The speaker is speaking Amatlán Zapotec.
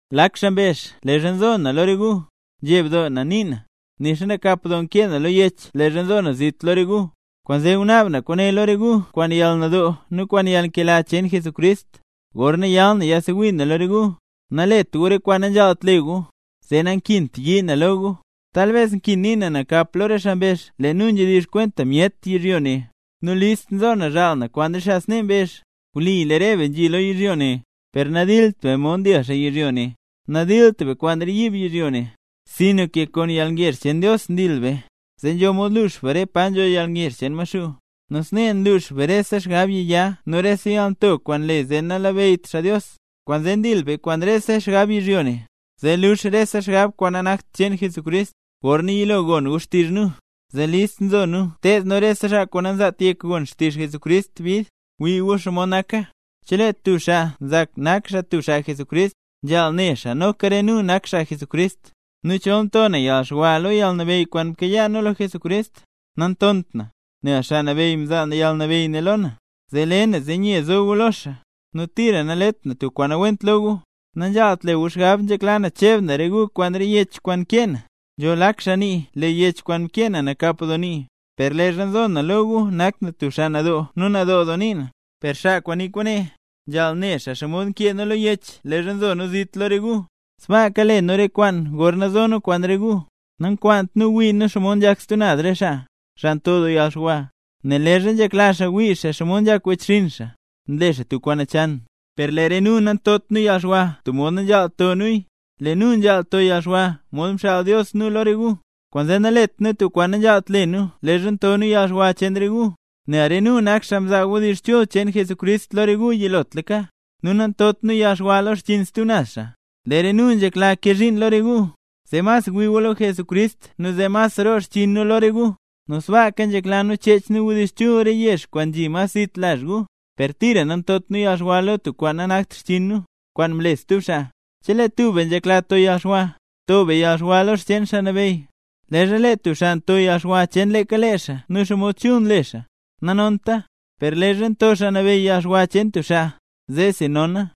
Lak xaa mbezh leezha nzo na lo re gu, nzheb doo na nii na, nixa nakap doo nkee na lo yech leezha nzo na zit lo re gu. Kwaanzee ngunaab na kwaane lo re gu kwaan yalnadoo nu kwaan yalnkela cheen Jesucrist. Gorna yal na yasewii na lo re gu, nalet gu re kwaan nanzhaalt le gu, zee nakint yii na lo gu. Talbes nkin nii na nakap lo re xaa mbezh, lee nu nzhedizh kwenta myet yizhyo ne; nu list nzo na zhaal na kwaan re xaa snee mbezh. Wli lee re be nzhi lo yizhyo ne, per nandilt be mod ndil xaa yizhyo ne. Nadilt be kwaan re yiib yizhyo ne, sinka kwaan yalngezh cheen Dios ndil be, zee nzho mod lux be re pa nzho yalngezh cheen Maxuu, nu snee nlux be rese xgab yiya nu rese yalnto kwaan nle zee nalabeyyt xaa Dios. Kwaanzee ndil be kwaan rese xgab yizhyo ne zee luux rese xgab kwaan nanakt cheen Jesucrist. Gorna yilo gon gu xtizh nu, zee listla nzo nu ted nu rese xaa kwaan nanzaat yek gon xtizh Jesucrist bid. Gwii gu xomod naka. Chelee tub xaa nzak nak xaa tub xaa Jesucrist, nzhaal ne xaa, noka re nu nak xaa Jesucrist. Nu chol nto na yalxwa lo yalnabeyy kwaan mkayaa nu lo Jesucrist, nantont na, nel Xaa Nabeyy mzaa yalnabeyy ne lo na, zee le na zee nye zo gu lo xaa, nu tira nalet na tub kwaan nawent lo gu. Nanzhaalt le gu xgab nzhekla na cheb na re gu kwaan re yech kwaan nkee na. Nzho lak xaa nii lee yech kwaan mkee na nakap doo nii, per leezha nzo na lo gu nak na tub xaa nadoo nu nadoo nii na. Per xaa kwaan nii kwaane, nzhaal ne xaa xomod nkee nu lo yech leezha nzo nu zit lo re gu, sbaaka le nu re kwaane gorna zo nu kwaan re gu. Nankwaant nu wii nu xomod nzhak stub naz re xaa, xaa nto doo yalxwa, nel leezha nzhekla xaa wii xaa xomod nzhak wechxinn xaa, nle xaa tub kwaan nachan. Per lee re nu nantot nu yalxwa tub mod nanzhaalt to nuya. Lee nu nzhaal to yalxwa mod mxaal Dios nu lo re gu. Kwaanzee nanlet nu tub kwaan nanzhaalt le nu leezha nto nu yalxwa cheen re gu, nel re nu nak xaa mzaa wdizh chul cheen Jesucrist lo re gu yilotlaka. Nu nantot nu yalxwa lo xchiin stub naz xaa. Lee re nu nzhekla kee zhiin lo re gu, zee mas wii gu lo Jesucrist nu zee mas roo xchiin nu lo re gu. Nu sbaaka nzhekla nu cheech nu wdizh chul re yezh kwaan nzhi mas zit lazh gu. Per tira nantot nu yalxwa lo tub kwaan nanakt xchiin nu, kwaan mle stub xaa. Chelee tub be nzhekla to yalxwa, to be yalxwa lo xcheen Xaa Nabeyy. Leezha lee tub xaa nto yalxwa cheen leeka lee xaa nu xomod chul nle xaa, nanonta. Per leezha nto Xaa Nabeyy yalxwa cheen tub xaa, zeesi nona.